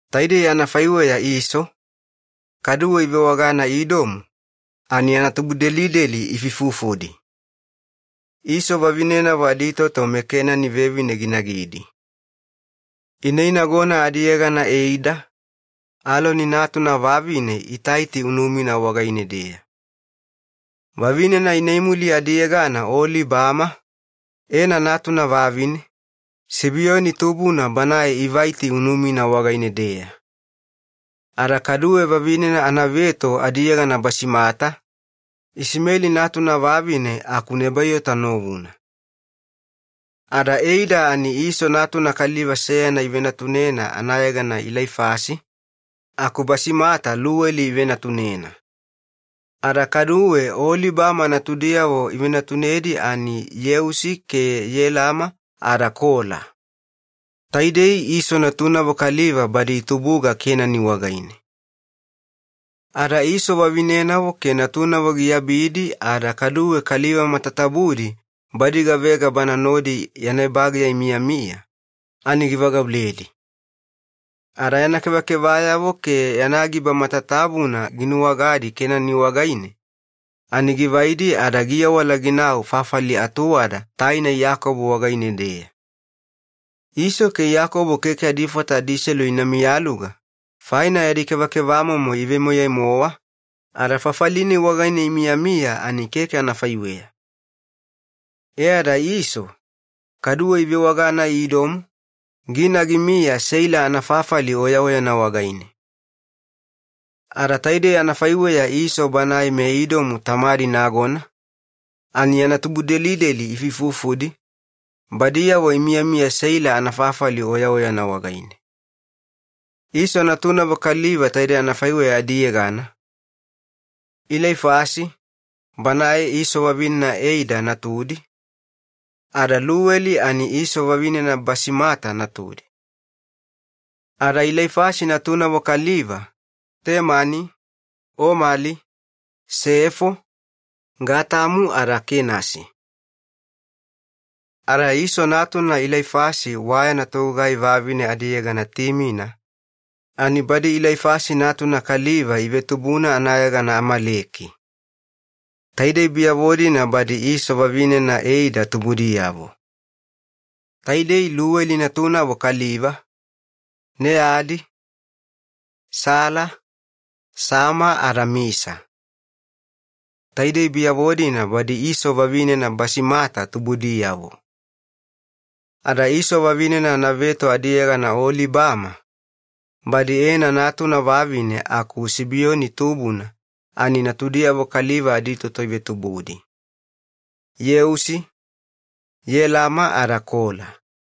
Taidei anafaiweya Iso, kaduwe ivewagana Idomu, ani yana tubudelideli ifuifufudi. Iso vavinenavo aditoto meKenani vevine ginagidi. Ineinagona adiyegana Eida, Eloni natuna vavine Itaiti unumina wagaine-deya. Vavinena ineimuli adiyegana Oolibama, Ena natuna vavine, Sibioni tubuna banae Aibaiti unumina wagaine-deya. Ada kaduwe vavinena anaveto adiyegana Basimata, Isimeli natuna vavine aku Nebaiota novuna. Ada Eida ani Iso natuna kaliva seyana ivenatunena anayegana Ilaifasi, aku Basimata Luweli ivenatunena. Ada kaduwe Oolibama natudiyavo ivenatunedi ani Yeusi ke Yelama ada Kola. Taidei Iso natunavo kaliva badi itubuga Kenani wagaine. Ada Iso vavinenavo ke natunavo giabidi ada kaduwe kaliva matatabudi badi gavega bana nodi yana ebageya imiyamiya ani givagauledi. Ada yana kevakevayavo ke yana giba matatabuna ginuwagadi Kenani wagaine ani givaidi ada giawala ginau fafali atuwada taina Iyakobo wagaine-deya. Iso ke Iyakobo keke adifata adiselu ina miyaluga faina yadi kevakevamomo ivemoyai-mowa, ada fafali-nai wagaine imiyamiya ani keke anafaiweya. E ada Iso, kaduwe ivewagana Idomu, gina gimiya Seila anafafali oyaoyana wagaine. Ada taidei anafaiweya Iso banae meIdomu tamadi nagona ani yana tubudelideli ifuifufudi, badiyavo imiyamiya Seila anafafali oyaoyana wagaine. Iso natunavo kaliva taidei anafaiweya adiyegana: Ilaifasi, banae Iso vavinena Eida natudi, ada Luweli ani Iso vavinena Basimata natudi. Ada Ilaifasi natunavo kaliva: Timeni, Omeli, Sefo, Getemu ada Kenasi. Ada Iso natuna Ilaifasi wayana togugai vavine adiyegana Timina, ani badi Ilaifasi natuna kaliva ivetubuna anayegana Amaleki. Taidei biyavo-dina badi Iso vavinena Eida tubudiyavo. Taidei Luweli natunavo kaliva: Neadi, Sila, Sama ada Misa. Taidei biyavo-dina badi Iso vavinena Basimata tubudiyavo. Ada Iso vavinena anaveto adiyegana Oolibama, badi Ena natuna vavine aku Sibioni tubuna ani natudiyavo kaliva aditoto ivetubudi: Yeusi, Yelama ada Kola.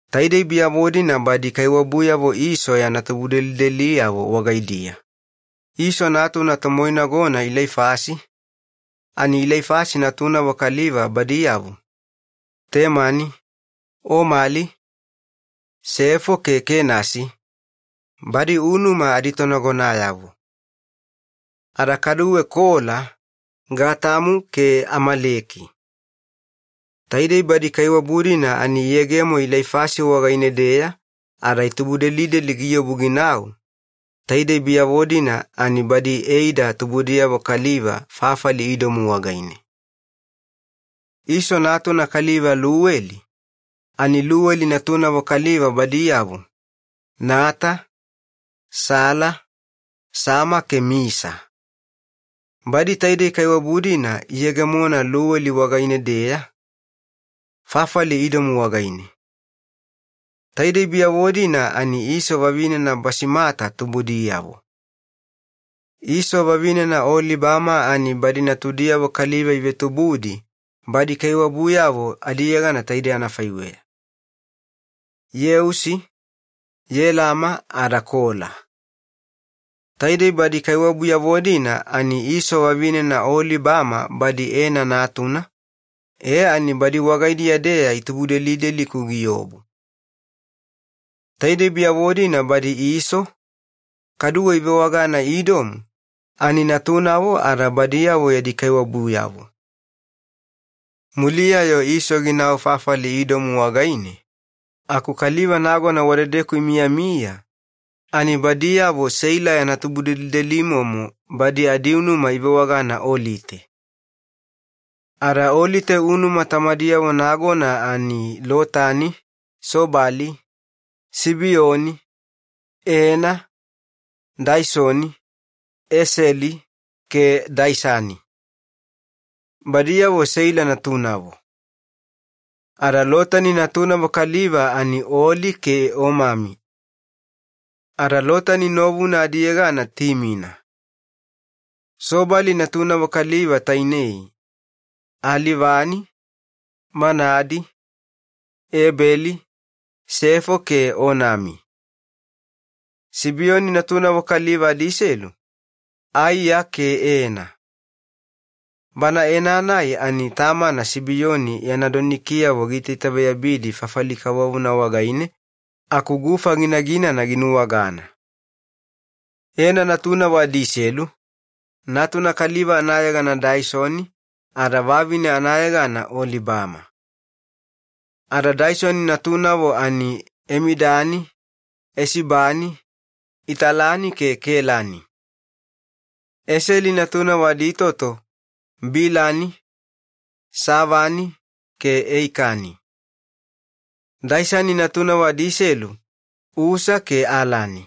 Taidei biyavo-dina badi kaiwabuyavo Iso yana tubudelideliyavo wagaidiya: Iso natuna tomoinagona Ilaifasi, ani Ilaifasi natunavo kaliva badiyavo: Temani, Omali, Sefo ke Kenasi, badi unuma aditonagonayavo. Ada kaduwe Kola, Gatamu ke Amaleki. Taidei badi kaiwabu-dina ani iyegemo Ilaifasi wagaine-deya ada itubudelideli giobu ginau, taidei biyavo-dina ani badi Eida tubudiyavo kaliva fafali Idomu wagaine. Iso natuna kaliva Luweli, ani Luweli natunavo kaliva badiyavo: Nata, Sela, Sama ke Misa. Badi taidei kaiwabu-dina iyegemona Luweli wagaine-deya, fafali Idomu wagaine. Taidei biyavo-dina ani Iso vavinena Basimata tubudiyavo. Iso vavinena Oolibama ani badi natudiyavo kaliva ivetubudi badi kaiwabuyavo adiyegana taidei anafaiweya: Yeusi, Yelama ada Kola. Taidei badi kaiwabuyavo-dina ani Iso vavinena Oolibama badi Ena natuna, e ani badi wagaidiya-deya itubudelideli-ku giobu. Taidei biyavo-dina badi Iso, kaduwe ivewagana Idomu, ani natunavo ada badiyavo yadi kaiwabuyavo. Muliya-yo Iso ginau fafali Idomu wagaine, aku kaliva nagona wadedeku imiyamiya badiyavo Seila yana tubudelidelimomo badi adiunuma ivewagana Olite. Ada Olite unuma tamadiyavo nagona ani Lotani, Sobali, Sibioni, Ena, Daisoni, Eseli ke Daisani. Badiyavo Seila natunavo. Ada Lotani natunavo kaliva ani Oli ke Omami. Ada Lotani novuna adiyegana Timina. Sobali natunavo kaliva tainei: Alivani, Manaadi, Ebeli, Sefo ke Onami. Sibioni natunavo kaliva adiselu, Aia ke Ena. Bana Ena-nai ani tamana Sibioni yana donikiyavo giitaitaveyabidi makama kavovona wagaine aku gufa ginaginana ginuwagana. Ena natunavo adiselu: natuna kaliva anayegana Daisoni ada vavine anayegana Oolibama. Ada Daisoni natunavo ani Emidani, Esibani, Italani ke Kelani. Eseli natunavo aditoto Bilani, Saavani ke Eikani. Daisani natunavo adiselu Usa ke Alani.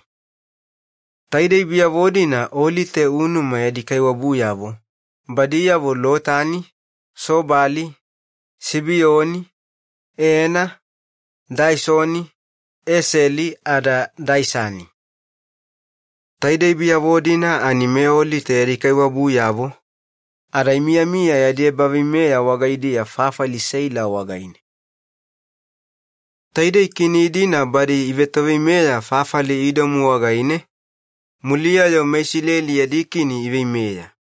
Taidei biyavo-dina Olite unuma yadi kaiwabuyavo: badiyavo Lotani, Sobali, Sibioni, Ena, Daisoni, Eseli ada Daisani. Taidei badiyavo ani meOlite yadi kaiwabuyavo, ada imiyamiya yadi ebaveimeya wagaidiya fafali Seila wagaine. Taidei kini-dina badi ivetoveimeya fafali Idomu wagaine, muliya-yo meIsileli yadi kini iveimeya: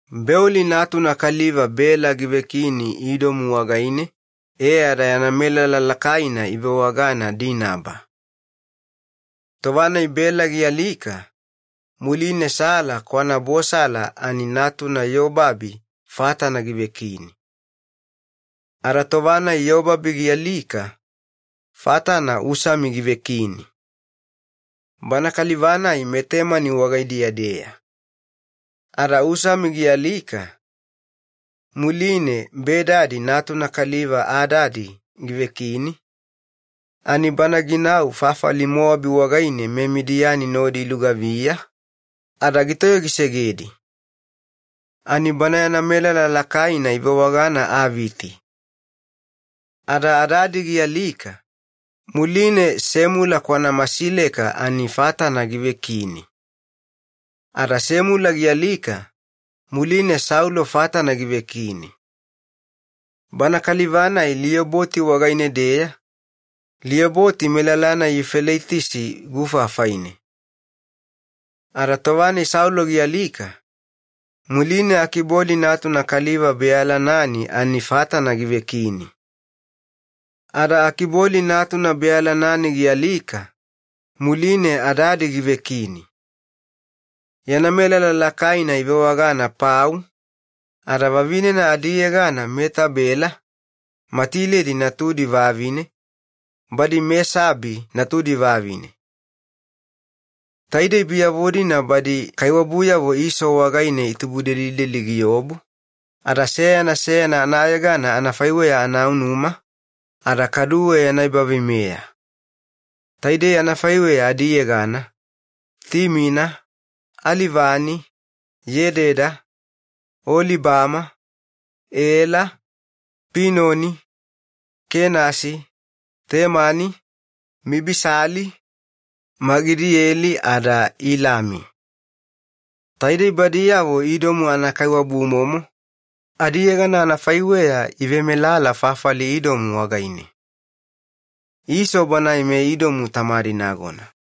Beoli natuna kaliva Bela givekini Idomu wagaine e ada yana melala lakaina ivewagana Dinaba. Tova-nai Bela gialika, muline Sela kwanaBosala ani natuna Yobabi fatana givekini. Ada tova-nai Yobabi gialika, fatana Usami givekini. Bana kaliva-nai meTemani wagaidiya-deya. Ada Usami gialika muline Bedadi natuna kaliva Adadi givekini, ani bana ginau fafali Mowabi wagaine meMidiani nodi ilugaviya ada gitoyogisegedi. Ani bana yana melala lakaina ivewagana anayegana Aviti. Ada Adadi gialika muline Semula kwanaMasileka ani fatana givekini. Ada Semula gialika, muline Saulo fatana givekini. Bana kaliva-nai Lioboti wagaine-deya, Lioboti melala-nai Yufeleitisi gufa afaine. Ada tova-nai Saulo gialika, muline Akiboli natuna kaliva Bealanani ani fatana givekini. Ada Akiboli natuna Bealanani gialika, muline Adadi givekini. Yana melala lakaina ivewagana Pau, ada vavinena adiyegana Meetabela, Matiledi natudi vavine, badi Mesaabi natudi vavine. Taidei biyavo-dina badi kaiwabuyavo Iso wagaine itubudelideli giobu, ada seyana seyana anayegana anafaiweya anaunuma ada kaduwe yana ebaveimeya. Taidei anafaiweya adiyegana: Timina, Alivani, Yededa, Oolibama, Ela, Pinoni, Kenasi, Temani, Mibisali, Magidieli ada Ilami. Taidei badiyavo Idomu anakaiwabumomo, adiyegana anafaiweya ivemelala fafali Idomu wagaine. Iso banae meIdomu tamadi nagona.